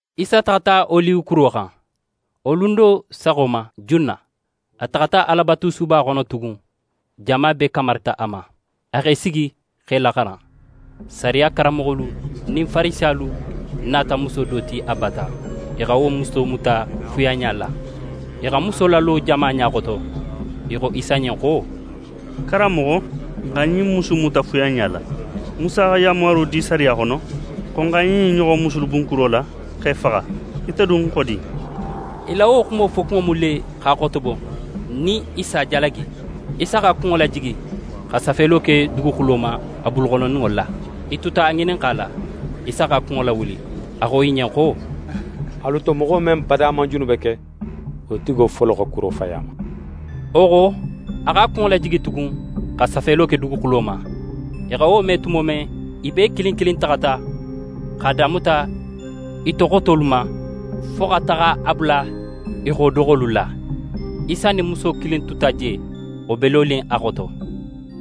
Isa taxata Oliwe kuro xan. Wo lun do saxo ma junna, a taxata Alabatusuba xono tugun, jama bee kamarita a ma. A x'é sigi, x'e laxaran. Sariya karanmoxolu nin Farisiyalu nata muso do ti a bata. I xa wo muso muta fuyanɲa la. I xa muso lalo jama ɲa xoto. I xo Isa ɲen xo: «Karanmoxo, n xa ɲin musu in muta fuyanɲa la. Musa xa yanmaro di sariya xono xo n xa ɲin ɲoxon musulu bun kuro la, x'e faxa. Ite dun xo di?» I la wo xumo fokunŋo mu le, x'a xotobo, nin i s'a jalagi. Isa x'a kunŋo lajigi xa safelo ke duguxulo ma, a buluxonondinŋo la. I tuta a ŋininxala. Isa x'a kunŋo lawuli. A xo i ɲen xo: «Alu to, moxo men bada man junube ke, wo tigo folo xa kuro fayi a ma.» Wo xo, a x'a kunŋo lajigi tugun, xa safelo ke duguxulo ma. I xa wo me tumo men, i bee kilin kilin taxata, x'a damuta i to xotolu ma, fo xa taxa a bula i xo doxolu la. Isa nin muso kilin tuta je, wo be lonin a xoto.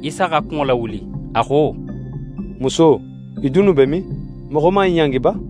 Isa x'a kunŋo lawuli, a xo: «Muso, i dunnu be min? Moxo man í ɲangi ba?»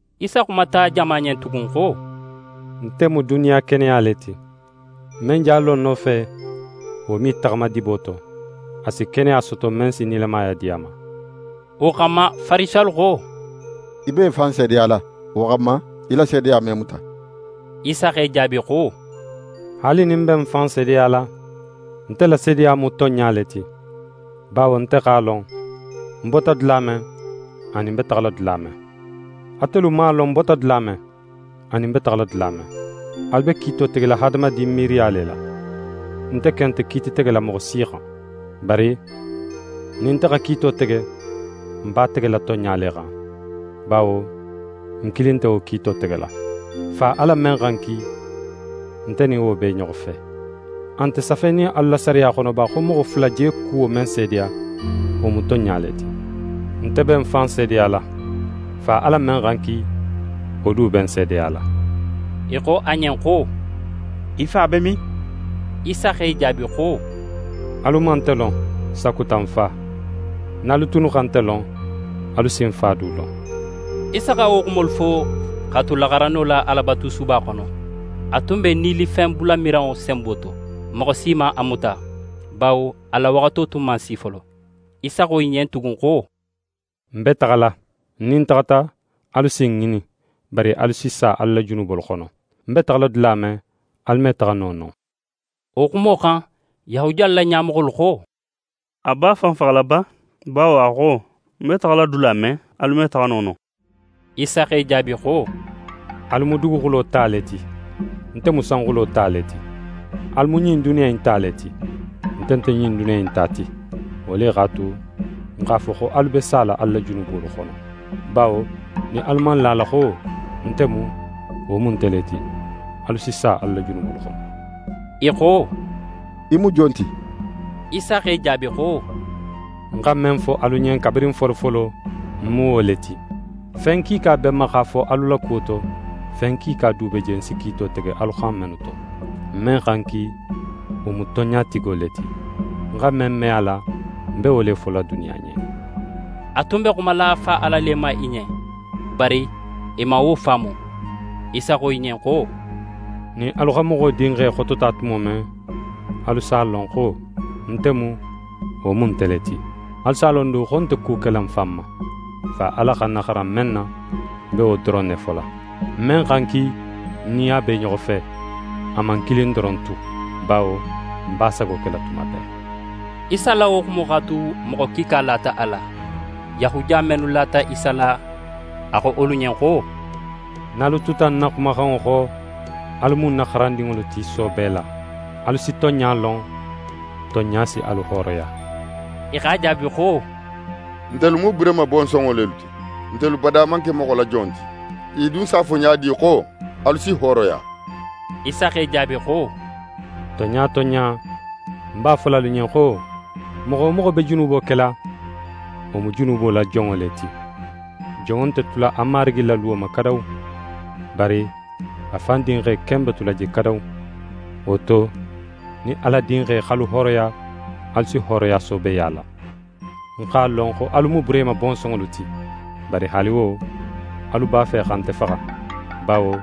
Isa xumata jama ɲen tugun xo: «Nte mu duniya keneya le ti. Men je a lo ń nofe, wo me í taxama dibo to. A si keneya soto men si nilamaya di a ma.» Wo xanma, Farisiyalu xo: «Í be í fan seedeyala. Wo xanma, í la seedeya me muta.» Isa x'e jaabi xo: «Haali nin ń be ń fan seedeyala, nte la seedeya mu tonɲa le ti, bawo nte x'a lon, ń bota dula men, anin ń be taxala dula men. Atelu man a lon ń bota dula men, anin ń be taxala dula men. Alu be kiito tegela hadamadin miiriya le la. Nte ken nte kiiti tegela moxo si xan. Bari nin nte xa kiito tege, ń b'a tegela tonɲa le xan, bawo ń kilin nte wo kiito tegela. Fa Ala men xa ń ki, nte nin wo be i ɲoxo fe. A nte safenin alu la sariya xono ba, xo moxo fula je kuwo men seedeya, wo mu tonɲa le ti? Nte be ń fan seedeyala. Fa Ala men xa ń ki, wo du be ń seedeyala.» I xo a ɲen xo: «Í Fa be min?» Isa x'e jaabi xo: «Alu man nte lon, sakuta ń Fa. Nin alu tunnu xa nte lon, alu si ń Fa du lon.» Isa xa wo xumolu fo, x'a tu laxaranno la Alabatusuba xono. A tun be nilifenbulamiranŋo senbo to. Moxo si man a muta, bawo a la waxato tun man si folo. Isa xo i ɲen tugun xo: «Ń be taxala. Nin ń taxata, alu si ń ŋinin, bari alu si sa alu la junubolu xono. Ń be taxala dula men, alu me taxa no non.» Wo xumo xan, Yahudiyalu la ɲamoxolu xo: «A b'a fan faxala ba? Bawo a xo: “Ń be taxala dula men, alu me taxa no non.”» Isa x'e jaabi xo: «Alu mu duguxulo ta le ti. Nte mu sanxulo ta le ti. Alu mu ɲin duniya in ta le ti. Nte nte ɲin duniya in ta ti. Wo le x'a tu, ń x'a fo xo alu be sala alu la junubolu xono. Bawo nin alu man la a la xo: “Nte mu” wo mu nte le ti, alu si sa alu la junubolu xono.» I xo: «Í mu jon ti?» Isa x'e jaabi xo: «Ń xa men fo alu ɲen kabirin folofolo, ń mu wo le ti. Fen kiika be ń ma, x'a fo alu la kuwo to, fen kiika du be je ń si kiito tege alu xan mennu to. Men xa ń ki, wo mu tonɲatigo le ti. Ń xa men me a la, ń be wo le fola duniya ɲen.» A tun be xumala Fa Ala le ma i ɲen. Bari i man wo faamu. Isa xo i ɲen xo: «Nin alu xa Moxo Dinxe xotota tumo men, alu s'a lon xo: “Nte mu” wo mu nte le ti. Alu s'a lon du xo ń nte ku kela ń fan ma: Fa Ala xa ń naxaran men na, ń be wo doron ne fola. Men xa ń ki, ń nin a be i ɲoxo fe; a man ń kilin doron tu, bawo ń b'a sago kela tuma bee.» Isa la wo xumo x'a tu, moxo kiika lata a la. Yahudiya mennu lata Isa la, a xo wolu ɲen xo: «Nin alu tuta ń na xumaxanŋo xo, alu mu ń na xarandinŋolu ti soobe la. Alu si tonɲa lon, tonɲa si alu hooroya.» I x'a jaabi xo: «Ntelu mu Burehima bonsonŋo lelu ti. Ntelu bada man ke moxo la jon ti. Í dun s'a fo ɲa di xo: “Alu si hooroya?”» Isa x'e jaabi xo: «Tonɲa tonɲa, ń b'a fola alu ɲen xo: Moxo wo moxo be junubo kela, wo mu junubo la jonŋo le ti. Jonŋo nte tula a marigi la luwo ma kadawu. Bari a fan dinxe ken be tula je kadawu. Wo to, nin Ala Dinxe x'alu hooroya, alu si hooroya soobeya la. Ń x'a lon, xo alu mu Burehima bonsonŋolu ti. Bari haali wo, alu b'a fe xa nte faxa, bawo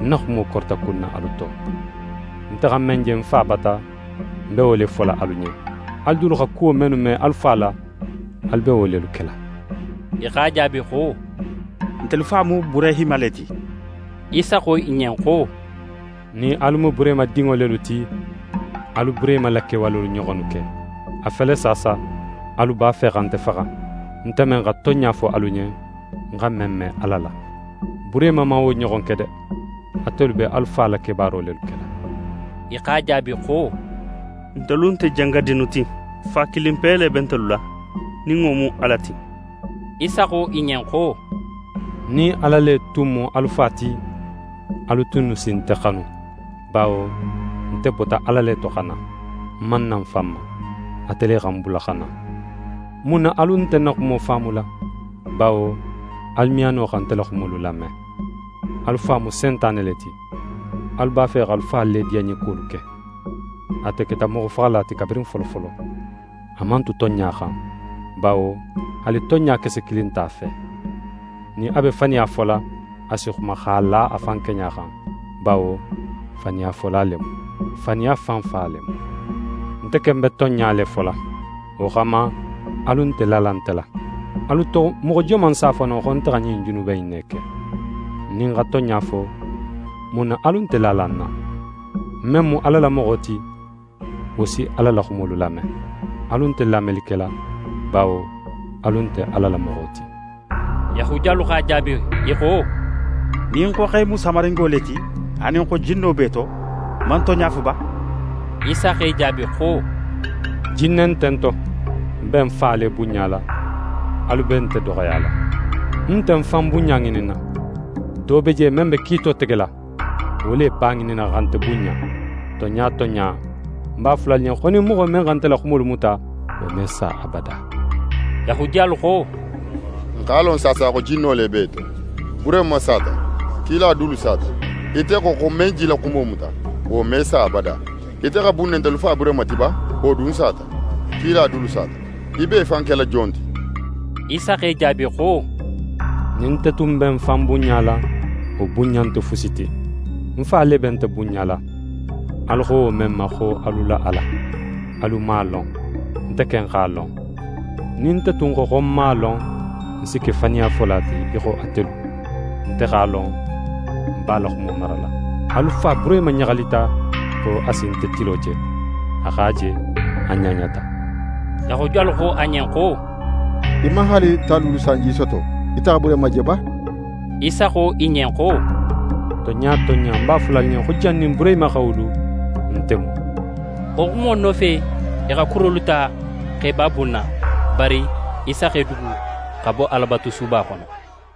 ń na xumo korita kunna alu to. Nte xa men je ń Fa bata, ń be wo le fola alu ɲen. Alu dulu xa kuwo mennu me alu fa la, alu be wo lelu kela.» I x'a jaabi xo: «Ntelu fa mu Burehima le ti.» Isa xo i ɲen xo: «Nin alu mu Burehima dinŋo lelu ti, alu Burehima la kewalolu ɲoxonnu ke. A fele saasa, alu b'a fe xa nte faxa, nte men xa tonɲa fo alu ɲen, ń xa men me Ala la. Burehima man wo ɲoxon ke de! Atelu be alu fa la kebaaro lelu kela.» I x'a jaabi xo: «Ntelu nte jangadinnu ti. Fa kilinpe le be ntelu la, nin wo mu Ala ti.» Isa xo i ɲen xo: «Nin Ala le tun mu alu Fa ti, alu tunnu si nte xanu, bawo nte bota Ala le to xa na. Ń man na ń fan ma. Ate le xa ń bula xa na. Mun na alu nte ń na xumo faamula? Bawo alu me a no xa nte la xumolu lame. Alu fa mu Sentane le ti. Alu b'a fe x'alu fa le diyanɲekuwolu ke. Ate keta moxofaxala ti kabirin folofolo. A man tu tonɲa xan, bawo haali tonɲa kese kilin nt'a fe. Nin a be faniya fola, a si xuma x'a la a fan keɲa xan, bawo faniyafola le mu. Faniya fan fa le mu. Nte ken be tonɲa le fola. Wo xanma alu nte lala nte la. Alu to moxo joman s'a fo no, xo nte xa ɲin junube in ne ke? Nin ń xa tonɲa fo, mun na alu nte lala ń na? Men mu Ala la moxo ti, wo si Ala la xumolu lame. Alu nte lameli kela bawo alu nte Ala la moxo ti.» Yahudiyalu x'a jaabi, i xo: «Nin n xo x'é mu Samaringo le ti anin xo jinno b'é to, n man tonɲa fo ba?» Isa x'e jaabi xo: «Jinne nte ń to. Ń be ń Fa le bunɲala, alu be nte doxoyala. Ń nte ń fan bunɲa ŋininna. Do be je men be kiito tegela, wo le b'a ŋininna xa nte bunɲa. Tonɲa tonɲa, ń b'a fola alu ɲen xo, nin moxo men xa nte la xumolu muta, wo me sa abada.» Yahudiyalu xo: «N x'a lon saasa xo jinno le b'é to. Burehima sata, kila dulu sata, ite xo, xo men je í la xumo muta, wo me sa abada. Ite xa bun ne ntelu fa Burehima ti ba, wo dun sata, kila dulu sata? Í b'é fan kela jon ti?» Isa x'e jaabi xo: «Nin nte tun be ń fan bunɲala, wo bunɲa nte fusi ti. Ń Fa le be nte bunɲala, alu xo wo men ma xo “alu la Ala”. Alu man a lon. Nte ken x'a lon. Nin nte tun xo, xo ń man a lon, ń si ke faniyafola ti, í xo atelu. Nte x'a lon, ń b'a la xumo marala. Alu fa Burehima ɲaxalita xo a si nte tilo je. A x'a je, a ɲaɲata.» Yahudiyalu xo a ɲen xo: «Í man haali tan luulu sanji soto, ite xa Burehima je ba?» Isa xo i ɲen xo: «Tonɲa tonɲa, ń b'a fola alu ɲen xo, jannin Burehima xa wulu, “Nte mu.”» Wo xumo nofe, i xa kurolu ta, x'e b'a bunna. Bari Isa x'é dugu, xa bo Alabatusuba xono.